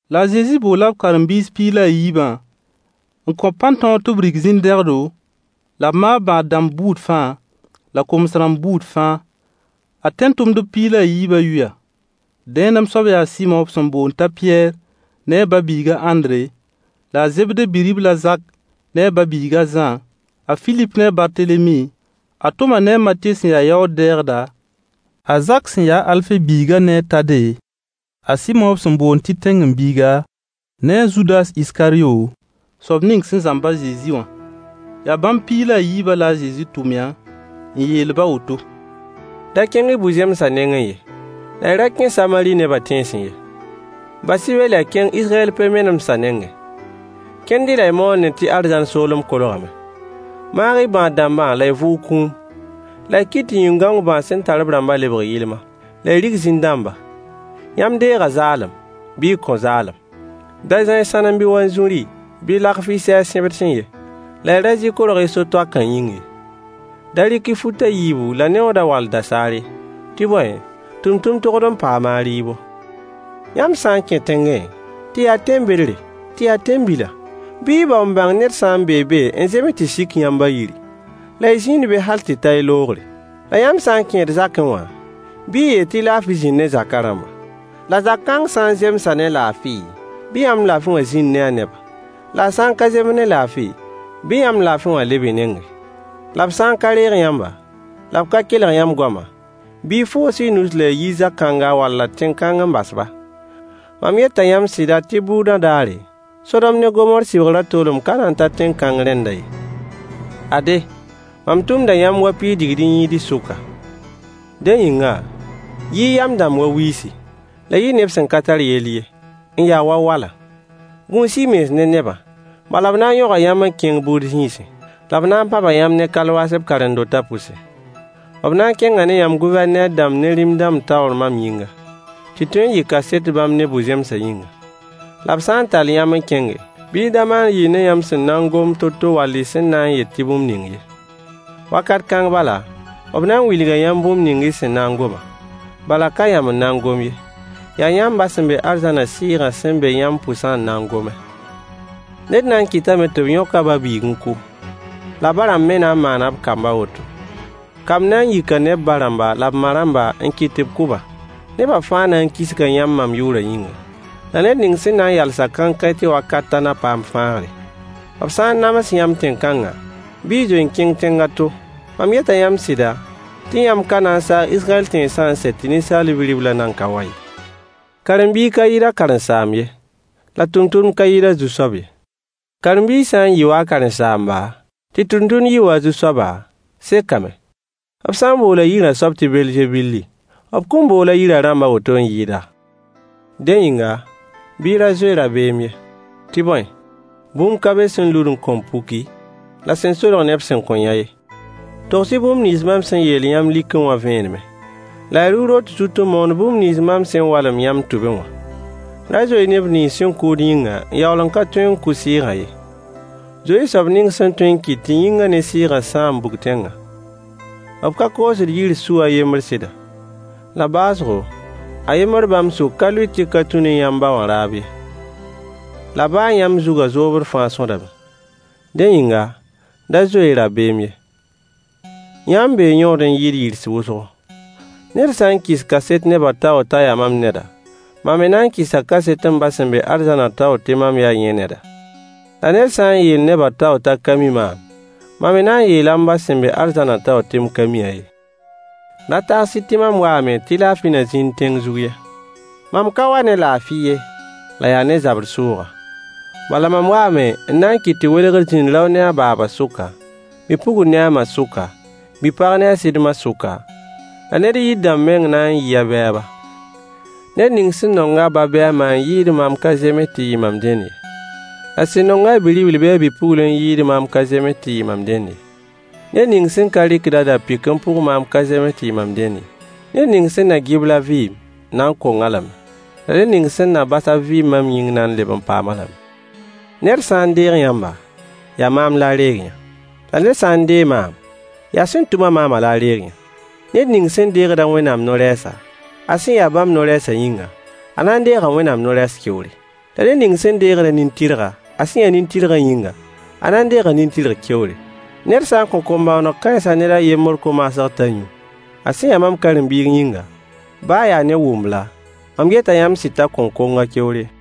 La a Zezi boola b karen-biis piig la a yiibã n kõ-b pãn-tõog tɩ b rig zĩn-dẽgdo, la b maag bãad-dãmb buud fãa la koms-rãmb buud fãa. Ad tẽn-tʋmdb piig la a yiibã yʋya: Dẽenem soab yaa a Sɩmo b sẽn boond t'a Pɩyɛɛr ne a ba-biig a Ãndre, la a Zebde bi-ribl a Zak ne a ba-biig a Zã, a Filip ne a Bartelemi, a Toma ne a Matye sẽn ya yaood-dɛɛgda, a Zak sẽn ya a Alfe biigã ne a Tade, a Sɩmo b sẽn boond tɩ Zelot ne a Zudas Iskaryo, soab ning sẽn zãmb a Zezi wã. Yaa bãmb piig la a yiibã la a Zezi tʋmyã, n yeel-b a woto: Da kẽng-y bu-zẽmsã nengẽ ye, la y ra kẽ Samari nebã tẽnsẽ ye. Bas-y be la y kẽng Israyɛl pe-menemdsã nengẽ. Kẽnd-y la y moondẽ tɩ arzãn soolem kolgame. Maag-y bãad-dãmba la y vʋʋg kũum, la y kɩt tɩ yĩn-gãong bãas sẽn tar b rãmbã lebg yɩlma, la y rig zĩn-dãmba. Yãmb deega zaalem, bɩ y kõ zaalem. Da zã-y sãnem bɩ wanzuri bɩ lagf y sɛɛg sẽbdsẽ ye, la y ra zɩ korg y so-toakã yĩng ye. Da rɩk-y fut a yiibu la neooda wall dasaar ye. Tɩ bõe, tʋmtʋmd togd n paama a rɩɩbo. Yãmb sã n kẽ tẽngẽ, tɩ yaa tẽn-bedre, tɩ yaa tẽn-bila, bɩ y bao n bãng ned sã n bee be n zems tɩ sik yãmb a yiri, la y zĩnd be hal tɩ ta y loogre. La yãmb sã n kẽed zakẽ wã, bɩ y yeel tɩ laafɩ zĩnd ne zakã rãmba. La zag-kãng sã n zemsa ne laafɩ, bɩ yãmb laafɩ wã zĩnd ne a nebã. La a sã n ka zems ne laafɩ, bɩ yãmb laafɩ wã leb y nengẽ. La b sã n ka reeg yãmba, la b ka kelg yãmb goamã, bɩ y foos y nus la y yi zag-kãnga walla tẽn-kãng n bas-ba. Mam yeta yãmb sɩda tɩ bʋʋdã daare, Sodom ne Gomoor sɩbgrã toolem ka na n ta tẽn-kãng rẽndã ye. Ade, mam tʋmda yãmb wa piis digd-n-yĩids sʋka. Dẽ yĩnga, yɩ-y yam dãmb wa wiisi, la y yɩ neb sẽn ka tar yell ye, n ya wa wala. Gũus-y y mens ne nebã, bala b na n yõga yãmb n kẽng bʋʋd zĩisẽ, la b na n pãba yãmb ne kalwaas b karen-dotã pʋse. B na n kẽnga ne yãmb Gʋvɛrneer dãmb ne rĩm-dãmb taoor mam yĩnga, tɩ tõe n yɩ kaset bãmb ne bu-zẽmsã yĩnga. La b sã n tall yãmb n kẽnge, bɩ y da maan yɩɩr ne yãmb sẽn na n gom to-to wall y sẽn na n yet tɩ bũmb ning ye. Wakat kãng bala, b na n wilga yãmb bũmb ning y sẽn na n gomã. Bala ka yãmb n na n gom ye, yaa yãmb ba sẽn be arzãnã Sɩɩgã sẽn be yãmb pʋsã n na n gome. Ned na n kɩtame tɩ b yõk a ba-biig n kʋ, la ba-rãmb me na n maana b kamb a woto. Kamb na n yika ne b ba-rãmb la b ma-rãmb n kɩt tɩ b kʋ-ba. Neba fãa na n kisga yãmb mam yʋʋrã yĩnga, la ned ning sẽn na n yals-a kãenkãe tɩ wakat ta na paam fãagre. B sã n nams yãmb tẽn-kãnga, bɩ y zoe n kẽng tẽng a to. Mam yeta yãmb sɩda tɩ yãmb ka na n saag Israyɛl tẽnsã n sɛ tɩ Ninsaal Bi-riblã nan ka wa ye. Karen-biig ka yɩɩd a karen-saamb ye, la tʋmtʋmd ka yɩɩd a zu-soab ye. Karen-biig sã n yɩ wa a karen-saamba, tɩ tʋmtʋmd yɩ wa a zu-soaba, sekame. B sã n boola yirã soab tɩ Belzebul, b kõn bool a yirã rãmb a woto n yɩɩda? Dẽ yĩnga, bɩ y ra zoe dabeem ye. Tɩ bõe, bũmb ka be sẽn lud n kõn puki, la sẽn solg neb sẽn kõn yã ye. Togs-y bũmb nins mam sẽn yeel yãmb likẽ wã vẽenemẽ, la y rʋ rot zut n moon bũmb nins mam sẽn walem yãmb tʋbẽ wã. Ra zoe-y neb nins sẽn kʋʋd yĩngã n yaool n ka tõe n kʋ sɩɩgã ye. Zoe-y soab ning sẽn tõe n kɩt tɩ yĩngã ne sɩɩgã sãam bug-tẽngã. B ka koosd yirg su a yembr sɩda? La baoosgo, a yembr bãmb sʋk ka lʋɩt tẽng tɩ ka tũ ne yãmb ba wã raab ye. La baa yãmb zugã zoobd fãa sõdame. Dẽ yĩnga, da zoe-y rabeem ye. Yãmb bee yõod n yɩɩd yirs wʋsgo. Ned sã n kɩs kaset nebã taoor t'a yaa mam neda, mam me na n kɩsa kaset m ba sẽn be arzãnã taoor tɩ mam yaa yẽ neda. La ned sã n yeel nebã taoor t'a ka mi maam, mam me na n yeela m ba sẽn be arzãnã taoor tɩ mam ka mi-a ye. Ra tags-y tɩ mam waame tɩ laafɩ na zĩnd tẽng zug ye. Mam ka wa ne laafɩ ye, la yaa ne zabr sʋʋga. Bala mam waame n na n kɩt tɩ welgr zĩnd rao ne a baaba sʋka, bi-pugl ne a ma sʋka, bi-pag ne a sɩd ma sʋka, la ned yir dãmb meng n na n yɩ a bɛɛba. Ned ning sẽn nong a ba bɩ a ma n yɩɩd maam ka zems tɩ yɩ mam dẽnd ye. La sẽn nong-a a bi-ribl bɩ a bi-pugl n yɩɩd maam ka zems tɩ yɩ mam dẽnd ye. Ned ning sẽn ka rɩkd a da-pɩk n pʋg maam ka zems tɩ yɩ mam dẽnd ye. Ned ning sẽn na gɩbl a vɩɩm, na n kong-a lame. La ned ning sẽn na bas a vɩɩm mam yĩng na n leb n paam-a lame. Ned sã n deeg yãmba, yaa maam la a reeg-yã. La ned sã n deeg maam, yaa sẽn tʋm-a maamã la a reeg-yã. Ned ning sẽn deegd Wẽnnaam no-rɛɛsa, a sẽn ya bãmb no-rɛɛsã yĩnga, a na n deega Wẽnnaam no-rɛɛs keoore. La ned ning sẽn deegd nin-tɩrga, a sẽn ya nin-tɩrgã yĩnga, a na n deega nin-tɩrg keoore. Ned sã n kõ kom-bõoneg kãensã ned a yembr ko-maasg t'a yũ, a sẽn ya mam karen-biig yĩnga, baa ya ne wũmbla, mam yeta yãmb sɩd t'a kõn kong a keoor ye.